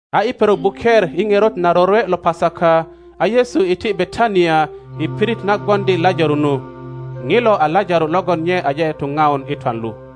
A i perok buker i ŋerot na rorwe lo Pasaka, a Yesu iti Betania i pirit na gwoŋdi Lajaro nu. ŋilo a Lajaro logon nye aje tuŋaun i twan lu.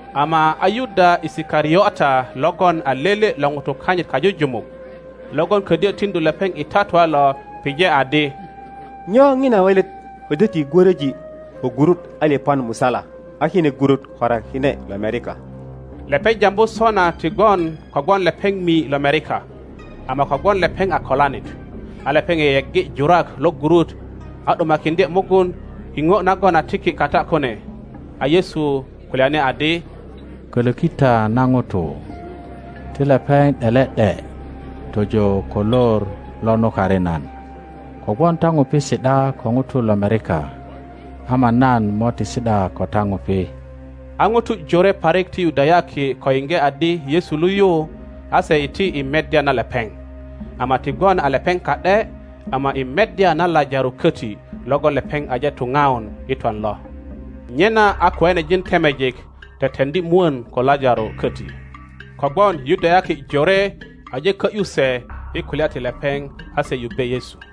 Ama a Yuda Isikariota logon a lele lo ŋutu kanyit kajujumuk, logon ködyö tiŋdu lepeŋ i tatua lo, pije adi, Nyo ŋina welet ködyö ti gwöröji ko gurut alipan musala, a kine gurut korakine lomerika? Lepeŋ jambu sona ti gwon kogwon lepeŋ mi lomerika, ama kogwon lepeŋ a kolanit, a lepeŋ yeyeggi jurak lo gurut a ’dumakiŋdye mugun i ŋo nagon a tiki kata kune. A Yesu kulyani adi, Kölöki ta na ŋuto; ti lepeŋ ’dele ’de tojo ko lor lo nukari nan; kogwon ta ŋupi si ’da ko ŋutu lomerika, ama nan mo ti si ’da ko ta ŋupi. A ŋutu jore parik ti Yudayaki ko yiŋge adi Yesu lu yu, a se iti i meddya na lepeŋ; ama ti gwon a lepeŋ ka ’de, ama i meddya na Lajaro köti logon lepeŋ aje tuŋaun i twan lo. Nyena a kiŋanejin temejik teteŋdi mwön ko Lajaro köti, kogwon Yudayaki jore aje kö ’yu se i kulya ti lepeŋ a se yubbe Yesu.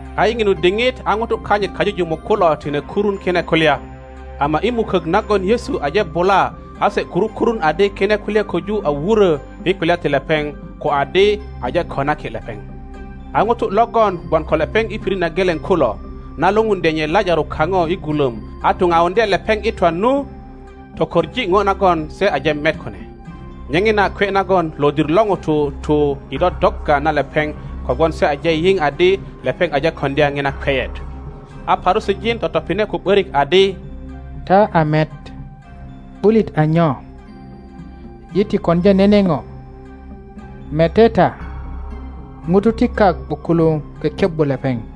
A i ŋinu diŋit a ŋutu kanyit kajujumuk kulo tine kurun kine kulya, ama i mukök nagon Yesu aje bula a se kuru kurun adi kine kulya köju a wurö i kulya ti lepeŋ ko adi aje konaki lepeŋ. A ŋutu logon gwon ko lepeŋ i pirit na geleŋ kulo, na lupundye nye Lajaro kaŋo i gulöm a tuŋauŋdye lepeŋ i twan nu, tokoŋ ŋo nagon se aje met kune. Nye ŋina kwe nagon lodir lo ŋutu tu i dodogga na lepeŋ kogwon se aje yiŋ adi lepeŋ aje koŋdya ŋina kweyet. A Parusijin totopine ko ’börik adi, Ta a met, ’bulit a nyo? Yi ti koŋdya nene ŋo. Mete ta, ŋutu ti kak ’bukuluŋ kekebbi lepeŋ.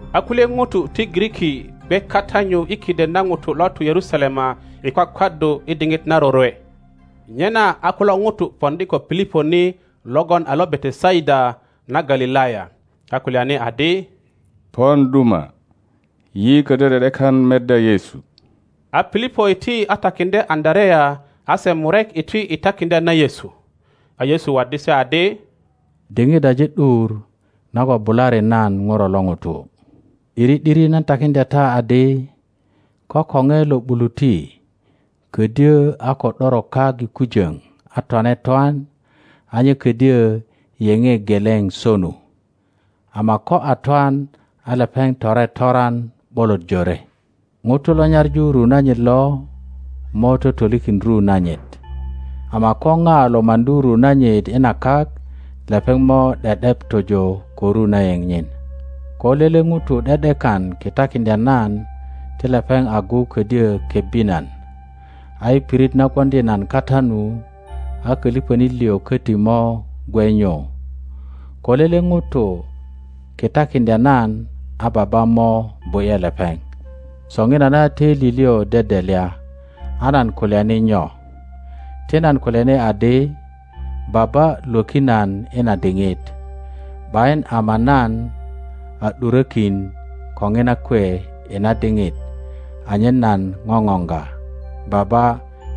A kulye ŋutu ti Giriki gwe kata nyu i kiden na ŋutu lo tu Yerusalema i kwakwaddu i diŋit na rorwe. Nyena a kulo ŋutu poŋdi ko Pilipo ni logon a lo Betesaida na Galilaya, a kulyani adi, Pon duma, yi ködyö ’de ’dekan meddya Yesu. A Pilipo iti a takiŋdye Andarea, a se murek iti i takiŋdya na Yesu. A Yesu waddi se adi, Diŋit aje ’dur nagon bulari nan Ŋuro lo ŋuto. ’Diri ’diri nan takiŋdya ta adi, Ko koŋe lo ’buluti ködyö a ko ’doro kak i kujoŋ a twane twan, a nye ködyo yeŋe geleŋ sonu, ama ko a twan, a lepeŋ tore toran ’bolot jore. Ŋuto lo nyaŋu ru nanyit lo mo totolikin ru nanyit, ama ko ŋa lo maŋdu ru nanyit i na kak, lepeŋ mo ’de ’dep tojo ko ru na yeŋ nyin. Ko lele ŋuto ’de ’dekan kitakiŋdya nan ti lepeŋ agu ködyo kebbi nan, a i pirit na gwoŋdi nan kata nu a kölipönit liŋ koti mo gwe nyu. Ko lele ŋuto kitakiŋdya nan, a Baba mo bu ’ye lepeŋ. Soŋinana töili liŋ dedelya, a nan kulyani nyo? Ti nan kulyani adi, Baba lwöki nan i na diŋit? ’Bayin, ama nan a ’durökin ko ŋina kwe i na diŋit anyen nan ŋoŋoŋga. Baba,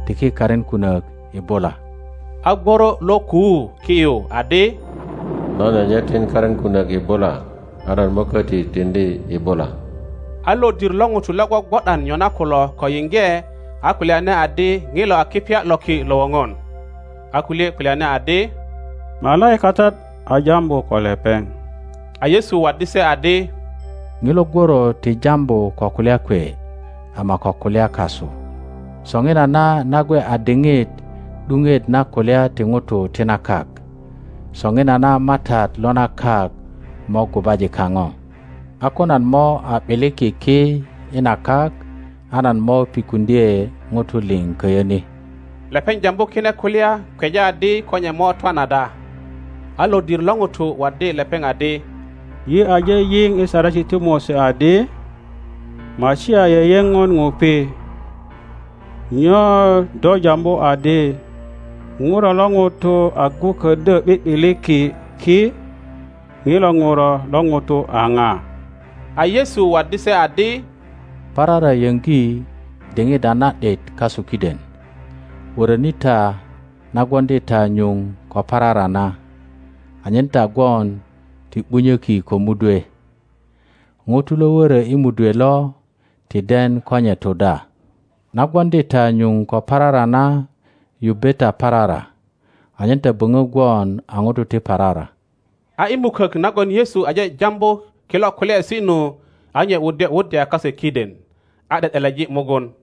tiki karin kunök i bula. A gworo lo kuu ki yu adi, Nan aje tin karin kunök i bula, a nan mo köti tiŋdi i bula. a lodir lo ŋutu lo gwogwo ’dan nyona kulo ko yiŋge, a kulyani adi ŋilo a kipya lo ki lo woŋon. A kulye kulyani adi, Malaikatat a jambu ko lepeŋ. a Yesu waddi se adi, Ŋilo gworo ti jambu ko kulya kwe, ama ko kulya kasu. Soŋinana na gwe a diŋit ’duŋet na kulya ti ŋutu ti na kak; soŋinana matat lo na kak mo gubaji kaŋo. A ko nan mo a ’biliki ki i na kak, a nan mo pikuŋdye ŋutu liŋ köyö ni. Lepeŋ jambu kine kulya kweja adi ko nye mo twan ada. A lodir lo ŋutu waddi lepeŋ adi, Yi aje yiŋ i Saresi ti Mose adi, Masia yeyeŋon ŋupi. Nyo do jambu adi, Ŋuro lo ŋuto agu ködyö ’bi ’biliki ki? Ŋilo Ŋuro lo ŋuto a ŋa? A Yesu waddi se adi, Parara yöŋgi diŋit a na ’dit kasu kiden. Wöröni ta na gwoŋdi ta nyuŋ ko parara na, anyen ta gwon ti ’bunyöki ko mudwe. Ŋuto lo wörö i mudwe lo ti den ko nye tu da. Na gwoŋdi ta nyuŋ ko parara na, yubbe ta parara, anyen ta böŋo gwon a ŋutu ti parara. Yudayaki ’bak yupet A i mukök nagon Yesu aje jambu kilo kulyaesi nu, a nye wuddye wuddya kase kiden, a ’de ’deleji mugun.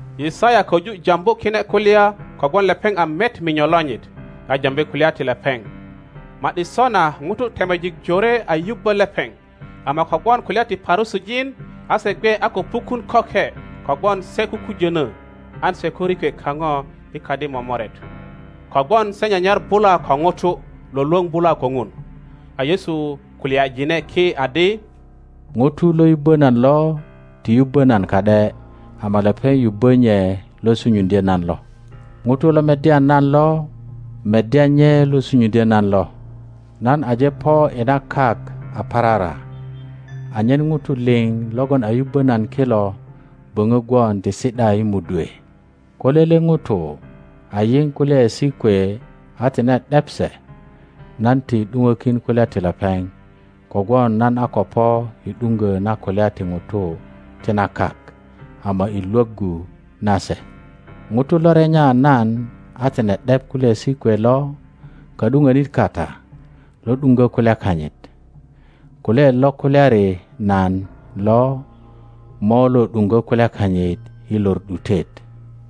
Yisaya köju jambu kine kulya kogwon lepeŋ a met minyo lonyit, a jambi kulya ti lepeŋ. Ma ’di sona ŋutu temejik jore a yubbö lepeŋ, ama kogwon kulya ti Parusijin a se gwe a ko pukun köke kogwon se kukujönö, an se ko rikwe kaŋo i kadi momoret; kogwon se nyanyar bula ko ŋutu lwölwöŋ bula ko Ŋun. A Yesu kulyajine ki adi, Ŋuto lo yubbö nan lo ti yubbö nan ka ’de, ama lepeŋ yubbö nye lo sunyuŋdyö nan lo. Ŋuto lo meddya nan lo meddya nye lo sunyuŋdyö nan lo. Nan aje po i na kak a parara, anyen ŋutu liŋ logon a yubbö nan kilo böŋö gwon ti si ’da i mudwe. Ko lele ŋuto a yiŋ kulyaesi kwe a tine ’dep se, nan ti ’duŋökin kulya ti lepeŋ; kogwon nan a ko po i ’duŋgö na kulya ti ŋutu ti na kak ama i lwöggu na se. ŋuto lo renya nan a tine ’dep kulyaesi kwe lo, ka ’duŋönit kata lo ’duŋgö kulya kanyit. Kulyaet lo kulyari nan lo mo lo ’duŋgö kulya kanyit i lor ’dutet;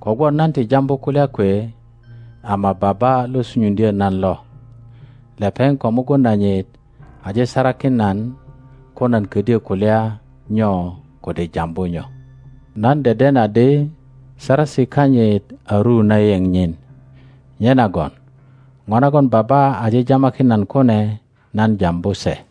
kogwon nan ti jambu kulya kwe, ama Baba lo sunyuŋdyö nan lo, lepeŋ ko mugun nanyit aje sarakin nan ko nan ködyö kulya nyo kode jambu nyo. Nan deden adi saresi kanyit a ru na yeŋ nyin. Nyenagon ŋo nagon Baba aje jamakin nan kune, nan jambu se.